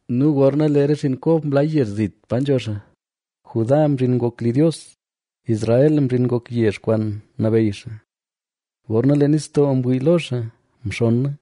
nu gorna lee re xinn Kob mlaa yezh zit pa nzho xaa, Judá mzhin ngok li Dios; Israel mzhin ngok yezh kwaan nabeyy xaa. Gorna lee nistoo mwii lo xaa mxonna;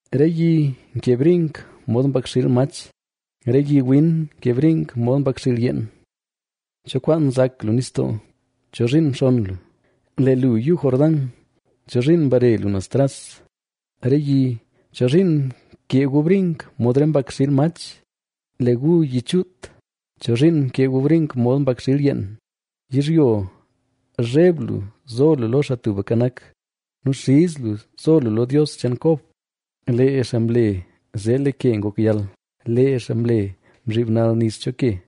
Re yi nkee briink mod mbakxiil mach, re yi win nkee briink mod mbakxiil yeen. ¿Cho kwaan nzak lu nistoo? Chozhiin mxonn lu? Lee lu Yuu Jordán, ¿chozhiin mbare lu naz tras? Re yi, ¿chozhiin mkee gu briink mod re mbakxiil mach? Lee gu yi chuut, ¿chozhiin mkee gu briink mod mbakxiil yeen? Yizhyo, zheb lu zo lu lo Xaa Tubka Nak, nu xiz lu zo lu lo Dios cheen Kob. Lee xaa mle zee lee ke ngok yal,c lee xaa mle mzhiib nal nis cho ke.